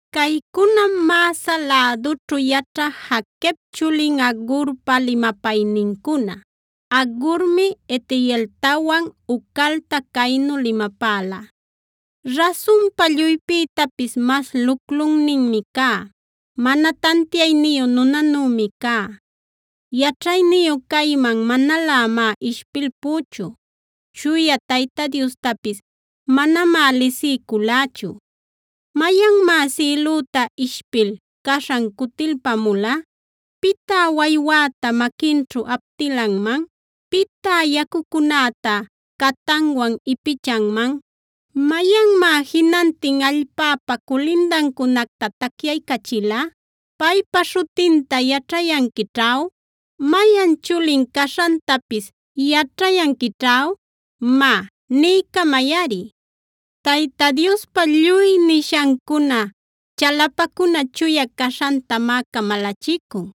Caycunam Massa lädućhu yaćha Jaquep chulin Agurpa limapaynincuna. Agurmi Itieltawan Ucalta caynu limapäla: Rasunpa lluypïtapis mas luclunninmi cá; mana tantiayniyu nunanümi cá. Yaćhayniyu cayman manalämá ishpilpüchu; Chuya Tayta Diostapis manamá lisiyculächu. ¿Mayanmá sïlüta ishpil caśhan cutilpamula? ¿Pitá waywäta maquinćhu aptilanman? ¿Pitá yacucunäta catanwan ipichanman? ¿Mayanmá jinantin allpäpa culindancunacta tacyaycachila? ¿¡Paypa śhutinta yaćhayanquićh aw!? ¿¡Mayan chulin caśhantapis yaćhayanquićh aw!? Má, niycamayꞌari. Tayta Diospa lluy nishancuna, chalapacuna chuya caśhantamá camalachicun.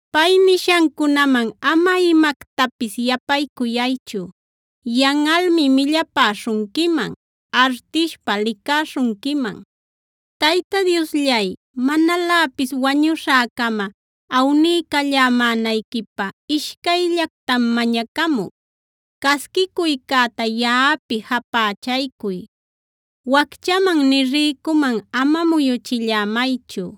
Pay nishancunaman ama imactapis yapaycuyaychu; yanꞌalmi millapäśhunquiman, artishpä licäśhunquiman. Tayta Diosllay, manaläpis wañuśhäcama awniycallämänayquipä ishcayllactam mañacamuc. Casquicuycäta yaꞌapi japächaycuy. Wacchaman nï rïcuman ama muyuchillämaychu.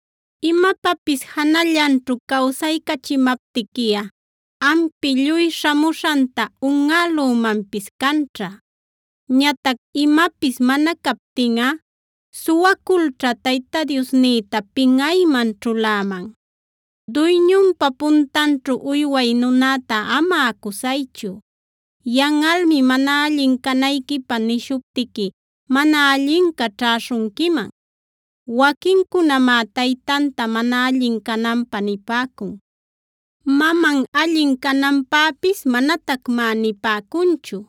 Imapapis janallanćhu cawsaycachimaptiquiꞌa, ampi lluy śhamuśhanta unꞌälümanpis canćha. Ñatac imäpis mana captinꞌa, suwaculćha Tayta Diosnïta pinꞌayman ćhuläman. Duyñunpa puntanćhu uyway nunäta ama acusaychu. Yanꞌalmi mana allin canayquipä nishuptiqui, mana allinca ćhäśhunquiman. Waquincunamá taytanta mana allin cananpä nipäcun; maman allin cananpäpis manatacmá nipäcunchu.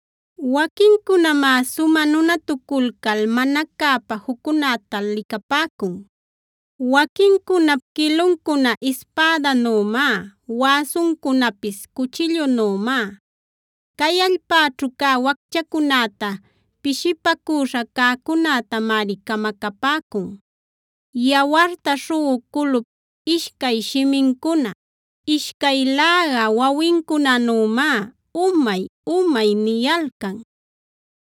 Waquincunamá sumä nunatuculcal mana cäpa juccunäta licapäcun. Waquincunap quiluncuna ispädanümá, wäsuncunapis cuchillunümá. Cay allpäćhu cä wacchacunäta, pishipacüśha cäcunätamari camacapäcun. Yawarta śhuꞌu culup ishcay shimincuna, ishcay läga wawincunanümá: “Umay-umay” niyalcan.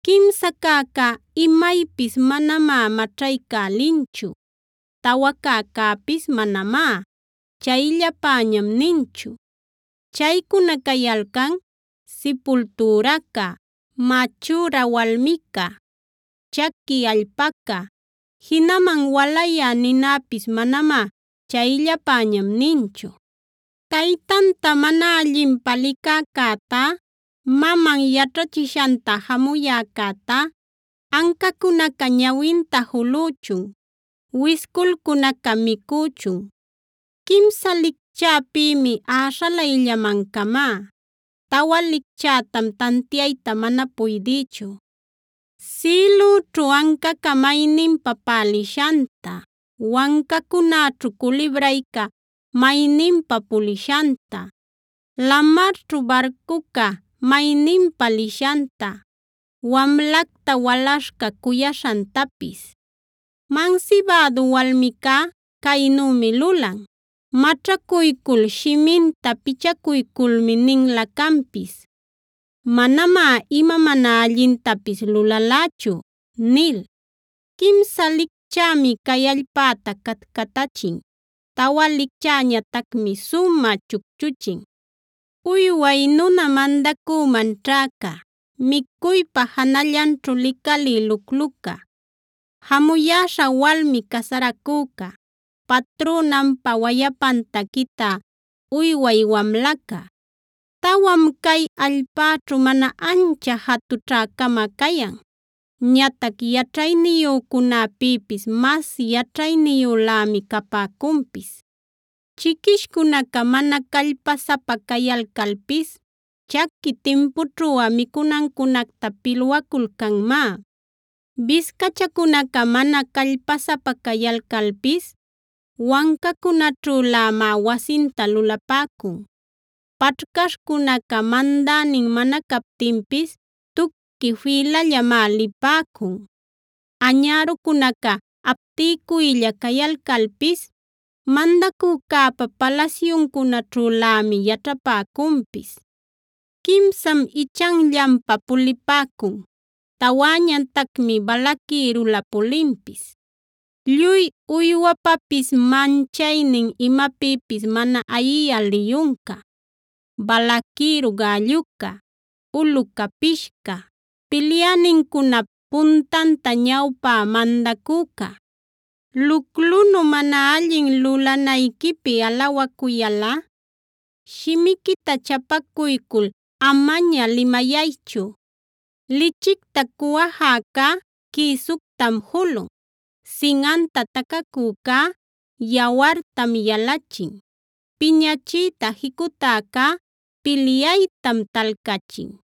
Quimsa cäca imaypis manamá maćhaycälinchu; tawa cäcäpis manamá: “Chayllapäñam” ninchu. Chaycuna cayalcan: sipultüraca, machüra walmica, chaqui allpaca, jinaman walayä ninäpis manamá “chayllapäñam” ninchu. Taytanta mana allinpä licäcätá, maman yaćhachishanta jamuyäcätá, ancacunaca ñawinta julüchun, wisculcunacac micüchun. Quimsa licchäpïmi äśhalayllaman camá; tawa licchätam tantiayta mana puydïchu: Sïlüćhu ancaca mayninpa pälishanta, wancacunäćhu culibrayca mayninpa pulishanta, lamarćhu barcuca mayninpa lishanta, wamlacta walaśhca cuyaśhantapis. Mansibädu walmicá caynümi lulan: Maćhacuycul shiminta pichaculculmi ninla canpis: “Manamá ima mana allintapis lulalächu” nil. Quimsa licchämi cay allpäta catcatachin; tawa licchäñatacmi sumä chucchuchin: Uyway nuna mandacüman ćhäca, micuypa janallanćhu licalï lucluca, jamuyäśha walmi casaracüca, patrünanpa wayapanta quitä uyway wamlaca. Tawam cay allpäćhu mana ancha jatućhä-cama cayan; ñatac yaćhayniyücunäpïpis mas yaćhayniyülämi capäcunpis: Chiquishcunaca mana callpasapa cayalcalpis, chaqui timpućhuꞌa micunancunacta pilwaculcanmá. Biscachacunaca mana callpasapa cayalcalpis wancacunäćhülämá wasinta lulapäcun. Paćhcaśhcunaca mandänin mana captinpis, tuqui fïlallamá lipäcun. Añärucunaca aptilcuylla cayalcalpis mandacücäpa palasyuncunaćhülämi yaćhapäcunpis. Quimsam ichanllanpa pulipäcun, tawäñatacmi balaquïrula pulinpis: Lluy uywapapis manchaynin, imapïpis mana ayiyä liyunca, balaquïru gälluca, ulu capishca, pilyänincunap puntanta ñawpä mandacüca. Luclunu mana allin lulanayquipi alawacuyalꞌa, shimiquita chapacuycul amaña limayaychu. Lichicta cuwajäcá quïsuctam julun, sinꞌanta tacacücá yawartam yalachin, piñachiyta jicutäcá pilyaytam talcachin.